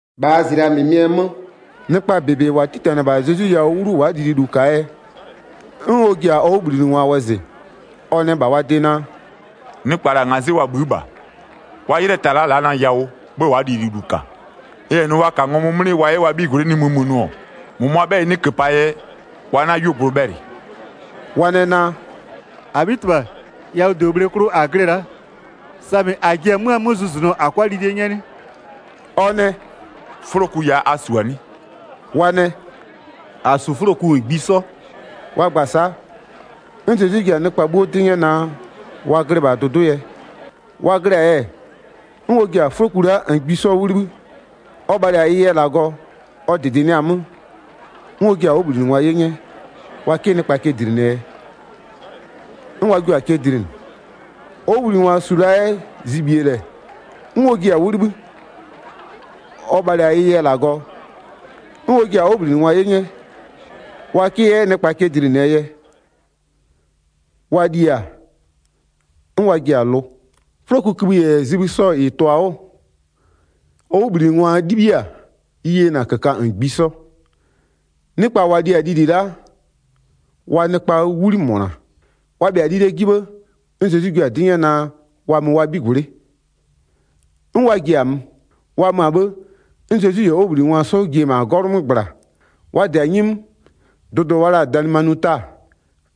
1-Bhaa zlɩa -mɩmɩɛ 'mö, nɩkpa -bebe -wa 'titanɩ-ɛ -bha Zezwi yawʋ 'wlu 'sɔ wa'a lililu -kaa yɛ, 'n ɔ ji-a ɔ 'wʋbhlinɩngwa wɔzɩ, ɔ nɛ -bha wa de naa: “Nɩkpa -la ngazɩ'ɩ wa bhï'ï -bha, wa 'ylɩɛ ta-a la'a na yawʋ, 'bhë wa'a lililu -ka. N -yɛ nʋ wa -ka ngɔmʋ 'mlɩ wa 'yɛ wa 'bhigwlɩ'ɩ nimï mö nʋ-ɔ, -mʋmʋaa 'bhɛyɩ 'nɩ -köpaa yɛ, wa 'na 'yuogblʋ bhɛlɩ.” Wa nɛ naa: “-Abhitɩbha, yawʋdobhle klʋ -a glɩ-ɛ la'a, samɩ -a ji-e 'mö-a 'mö zʋzʋnʋɔ -a 'kʋa lilie 'nyɛ 'nɩ?” Ɔ nɛ: “'Fʋloku ya a -su-a nɩ?” Wa nɛ: “-A -su 'fʋloku -ngbisɔ.” Wa gba-a sa'a, 'n Zezwi ji-a nɩkpa 'bhuo 'dɩ 'nyɛ naa, wa glɩ -bha dʋdʋ'ʋ yɛ. Wa glɩ-a yɛ, 'n ɔ ji-a 'fʋloku la'a -ngbisɔ 'wʋ 'libhï, ɔ bhalɩ-a ɩ yɛ -Lagɔ, ɔ -dɩdɩnɩɩ-a 'mö, 'n ɔ jiɩ-a ɔ 'wʋbhlinɩngwa 'ye 'nyɛ, wa 'kɩ nɩkpa cɛ dlinɩɛ yɛ. 'N wa jua-a cɛ dlinɩ. Ɔ 'wʋbhlinɩngwa -su la 'yɛ zibhie -lɛ, 'n ɔ jiɩ-a 'wʋ 'libhï, ɔ bhalɩ-a ɩ yɛ -Lagɔ, 'n ɔ jiɩ-a ɔ 'wʋbhlinɩngwa 'ye 'nyɛ, wa 'kɩ 'yɛ nɩkpa cɛ dlinɩɛ yɛ. Wa li-a, 'n wa ji-a lʋ. 'Fʋlokukïbhï -yɛ zibhï sɔ -ɩ tʋ-a 'wʋ, ɔ 'wʋbhlinɩngwa 'libhiɩ-a, ɩ yena -köka -ngbisɔ. Nɩkpa -wa li-a lili la'a, wa nɩkpaa 'wli -mʋna. Wa bhɩa-a lilie 'ji 'bhë-ë, 'n Zezwi jua-a 'dɩ 'nyɛ naa wa mö wa 'bhigwlɩ'ɩ. 'N wa ji-a mö. Wa mö-a 'bhë, 'n Zezwi -yɛ ɔ 'wʋbhlinɩngwa 'sɔ ji-e -ma 'gɔlʋ 'mö -gbla, wa -dɩ-a 'nyi 'mö, dʋdʋ wa la-a Dalɩmanuta,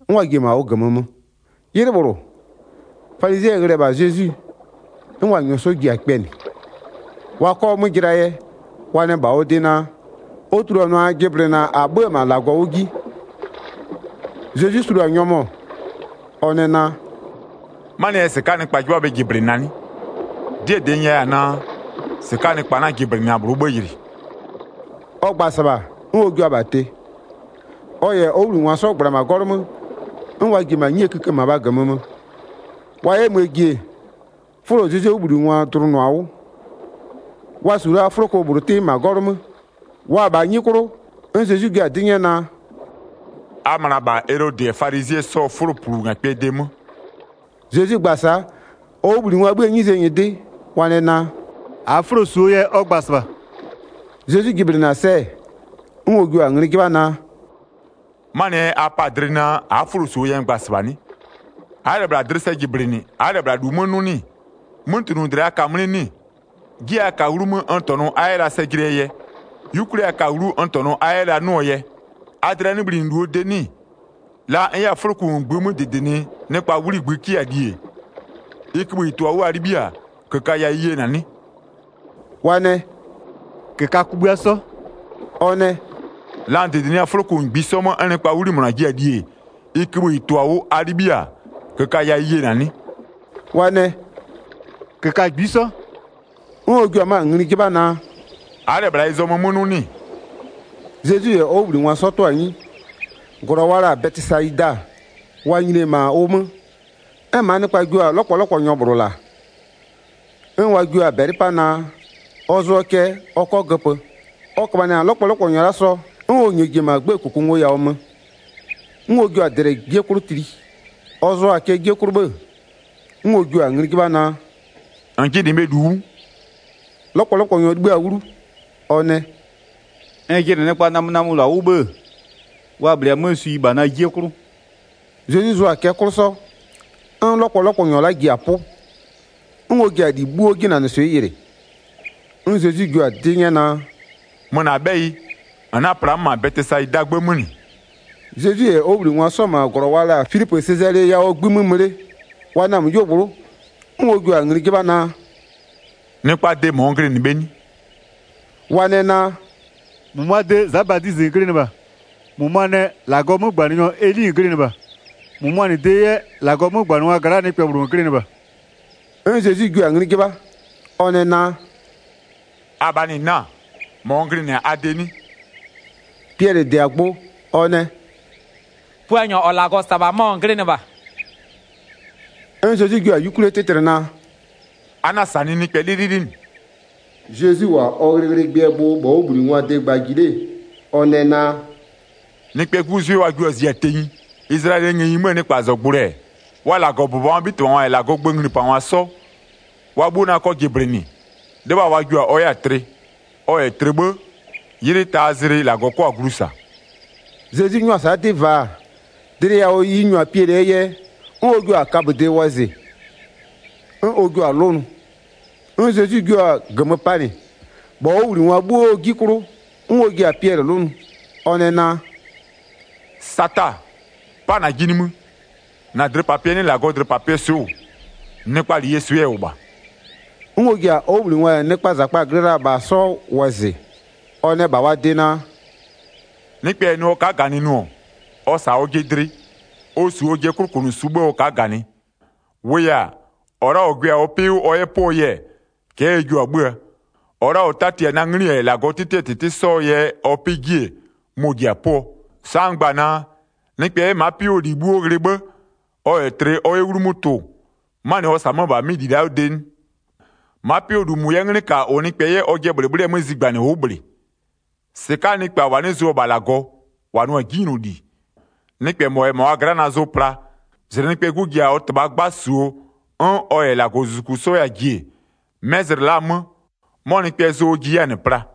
'n wa ji-e -ma ʋ -gömö mö. 'Ylɩ -bhlʋ, falizɩɛ ghlɩ-ɛ -bha Zezwi, 'n wa -nyɔɔ 'sɔ ji-a kpɛnɩ. Wa 'kɔ 'mö jɩlaa yɛ, wa nɛ -bha ɔ de naa: Ɔ tuluanʋa jɩblɩna -a 'bhö-ö -ma -Lagɔ 'wʋ ji. Zezwi sulu-a nyɔmʋ, ɔ nɛ naa: “'Manɩɛ yɛ -sɩka'aa nɩkpa 'jɩbha bhe jɩblɩna 'nɩ? 'Dɩɛ -dɩ n nyɛya-a naa: -Sɩka'aa nɩkpa 'na jɩblɩna -bhlʋɔ 'bhë yɩlɩ.” Ɔ gba-a -sɩbha, 'n ɔ jua-a -bha tɩ. Ɔ -yɛ ɔ 'wʋbhlinɩngwa 'sɔ -gbla-a -ma 'gɔlʋ 'mö, 'n wa ji-e -ma 'nyie 'kïkë -mabhaa -gömö mö. Wa 'yɛ möö ji-e, 'fʋlo Zezwie 'wʋbhlinɩngwa dlʋnʋ-a 'wʋ, wa -su la 'fʋloko -bhlʋ 'tɩ -ma 'gɔlʋ 'mö. Wa-a -bha 'nyi 'klʋ, 'n Zezwi jua-a 'dɩ 'nyɛ naa: “A möna -bha Elodɩ -yɛ falizɩɛ 'sɔɔ 'fʋloplungakpɩɛ de 'mö.” Zezwi gba-a sa'a, ɔ 'wʋbhlinɩngwaa 'bhïë 'nyizee nyɩdɩ wa nɛ naa: “-Aa 'fʋlo -suo yɛ ɔ gba-a -sɩbha.” Zezwi jɩblɩnɩ-a sɛ-ɛ, 'n ɔ jua-a ngli 'jɩbha naa: “'Manɩɛ yɛ a pa-a dlɩ naa, a'a 'fʋlo -suo yɛ n gba-a -sɩbha 'nɩ? A'a -lɛ -bhla dlɩ sɛ jɩblɩnɩ, a'a -lɛ -bhla -lu 'mö 'nʋ 'nɩ-ɩ? 'Mötunʋdlɩa a ka-a 'mlɩ 'nɩ-ɩ? 'Jie a ka-a 'wlumö n -tɔnʋ a 'yɛ la sɛ jɩnɩɛ yɛ, 'yukwlie a ka-a 'wlu, n -tɔnʋ a 'yɛ la 'nʋɔ yɛ, a dlɩa 'nɩ bhlinɩ -luo de 'nɩ-ɩ? La n 'yɛ-a 'fʋloku -ngbï 'mö -dɩdɩnɩ nɩkpaa 'wli -ngbï 'kɩ-a li-e, ɩ kïbhï -ɩ tʋ-a 'wʋ a 'libhiɩ-a, -köka ya ɩ yena 'nɩ?” Wa nɛ: “-Köka kugbïa 'sɔ.” Ɔ nɛ: “La n -dɩdɩnɩ 'yɛ-a 'fʋloku -ngbisɔ 'mö 'n nɩkpaa 'wli -mʋna jiɩ-a li-e, ɩ kïbhï -ɩ tʋ-a 'wʋ, a 'libhiɩ-a -köka ya ɩ yena 'nɩ?” Wa nɛ: “-Köka -ngbisɔ.” 'N ɔ jua 'mö-a ngli 'jɩbha naa: “A'a -lɛ -bhla ɩ zɔmö 'mö 'nʋ 'nɩ-ɩ?” Zezwi -yɛ ɔ 'wʋbhlinɩngwa 'sɔ 'tʋ-a 'nyi, -glɔ wa la-a Bɛtɩsayida wa nyini-e -ma ʋ 'mö, 'n -maa nɩkpa jio-a 'lɔkpɔlɔkpɔnyɔ -bhlʋ -la, 'n wa jio-a -bɛlɩ 'pa naa, ɔ zʋɔ cɛ ɔ 'kɔ göpö. Ɔ köbhanɩ-a 'lɔkpɔlɔkpɔnyɔ la'a sɔ, 'n ɔ -nyɔɔ ji-e -ma 'gbëë -kʋkʋngoyawʋ mö. 'N ɔ jio-a -dlɛ 'jie 'klʋ tli, ɔ zʋɔ-a cɛ 'jie 'klʋ 'bhë 'n ɔ jio-a ngli 'jɩbha naa: “-N jɩnɩ bhe -lu 'wʋ?” 'Lɔkpɔlɔkpɔnyɔ 'libhï-a 'wlu, ɔ nɛ: “N jɩnɩ nɩkpaa namönamölʋa 'wʋ 'bhë-ë, wa -bhlee-a 'mö swi -bha na 'jie 'klʋ.” Zezwi zʋɔ-a cɛ 'klʋ 'sɔ, 'n 'lɔkpɔlɔkpɔnyɔ la'a ji-a 'pʋ, 'n ɔ ji-a -li 'bhuo 'jinanɩswɩ'ɩ yɩlɩ. 'N Zezwi jio-a 'dɩ 'nyɛ naa: “Mö -na 'bhɛyɩ, -n 'na-a pla-a 'mö -ma Bɛtɩsayidaa 'gbë 'mö -nɩ.” Zezwi -yɛ ɔ 'wʋbhlinɩngwa 'sɔ-ɔ -ma -glɔ wa la-a Filipöö Sezalee yawʋɔ 'gbï 'mö mö 'le, wa namö 'yuogblʋ'ʋ, 'n ɔ jua-a ngli 'jɩbha naa: “Nɩkpaa de -mɔ n glɩnɩ bhe 'nɩ?” Wa nɛ naa: “-Mʋmʋaa de Za Badizɩ -n glɩnɩ -bha, -mʋmʋa nɛ: -Lagɔɔ 'mögbanɩnyɔ Eli -n glɩnɩ -bha, -mʋmʋaa -nɩ de 'yɛ, -Lagɔɔ 'mögbanɩngwa gla'aa nɩkpɛ -bhlʋ -n glɩnɩ -bha.” 'N Zezwi jua-a ngli 'jɩbha, ɔ nɛ naa: “Abhaa -nɩ 'na-a? -Mɔ n glɩnɩ-a a de 'nɩ?” Piɛlɩ -dɩ-a gbʋ, ɔ nɛ: “Puanyɔ -ɔ -Lagɔ -sa-a -bha mɔ -n glɩnɩ -bha.” 'N Zezwi jua-a 'yukwlie 'tɩtlɩ naa: “A 'na-a -sanɩɩ nɩkpɛ 'lɩlɩlɩ -nɩ.” Zezwi -wʋ-a ɔ ghlɩghlɩgbɩɛ gbʋ -bha ɔ 'wʋbhlinɩngwaa de gba ji 'le, ɔ nɛ naa: “Nɩkpɛɛ 'Gu 'zwɩ wa jio-a zia tenyi, Izlayɛlɩɛ ngëyi 'möö nɩkpazɔgblʋɩ-ɛ, wa -Lagɔbʋbɔngwaa 'bhitɩbhangwa -yɛ -Lagɔɔ gböö nglipangwa 'sɔ, wa 'bhuo 'na 'kɔ jɩblɩnɩ, 'lɩbha wa jio-a 'n ɔ 'yɛ-a tlɩ. Ɔ -yɛ tlɩ 'bhë, 'ylɩ taa zlɩ -Lagɔ 'kɔ-a glu -sa.” Zezwi 'nyʋa-a sa'a 'dɩ vaa, dlɩ yawʋ ɩ -nyu-a Piɛlɩɛ yɛ, 'n ɔ jio-a kaböde wɔzɩ, 'n ɔ jio-a 'lʋnʋ. 'N Zezwi jio-a -gömö panɩ -bha ɔ 'wʋbhlinɩngwa 'bhuoo 'ji 'klʋ, 'n ɔ ji-a Piɛlɩ 'lʋnʋ, ɔ nɛ naa: “Sata! 'Pa -najɩ nimï, -na dlɩpapɩɛ 'nɩ -Lagɔɔ dlɩpapɩɛɛ swɩ'ɩ -wʋ, nɩkpaa -leyie swɩ'ɩ ɛ -wʋ -bha.” 'N ɔ ji-a ɔ 'wʋbhlinɩngwa -yɛ nɩkpaa -zakpa-a glɩ la-a -bha 'sɔ wɔzɩ, ɔ nɛ -bha wa de naa: “Nɩkpɛ -yɛ nʋ ɔ ka'a -ganɩ nʋ-ɔ, ɔ -sa ɔjɩ dlɩ, ɔ -su ɔjɩɛ 'klʋkʋnʋsu 'bhë ɔ ka'a -ganɩ. 35-Wʋʋ yɛ-a, -ɔ la'a -ɔ gwɩ-a ɔ 'pɩ 'wʋ ɔ 'yɛ 'pʋɔ yɛ, cɛ'ɛ ɛ jio-a 'bhö-öö. -Ɔ la'a -ɔ 'tati-a na 'nglɩ -yɛ -Lagɔɔ 'tɩtɩɛ -tɩtɩ 'sɔɔ yɛ ɔ 'pɩ 'ji-e, mɔ-ɔ ji-a 'pʋɔ. Sa'a n gba-a naa: Nɩkpɛ 'yɛ ma'a 'pɩ 'wʋɔ -li 'bhuo ghlɩ 'bhë, ɔ -yɛ tlɩ ɔ 'yɛ 'wlumö tʋ-ʋ, 'manɩ ɔ -sa-a 'mö-ö -bha 'mɩ -li la'aa de 'nɩ? Ma'a 'pɩ 'wʋɔ -lu -mʋ 'yɛ 'nglɩ -ka -ʋ nɩkpɛ 'yɛ ɔjɩɛ -bhlɩbhlɩɛ 'mö zigbanɩnɩ ʋ'ʋ -bhlɩ. 38-Sɩka'aa nɩkpa -wa 'nɩ zʋ-ɔ -bha -Lagɔ, -wa nʋ-a 'jinyloli, nɩkpɛ -mɔ -yɛ -ma wa gla'a na zʋ pla, -zlɩ Nɩkpɛɛ 'Gu ji-a ɔ -Tɩbhaa 'gba -suo 'n ɔ -yɛ -Lagɔzuzuku 'sɔ 'yɛ-a ji-e, 'mɛ zlɩ la'a 'mö, 'mɔ nɩkpɛɛ zʋ ɔ ji 'yɛ-a -nɩ pla.”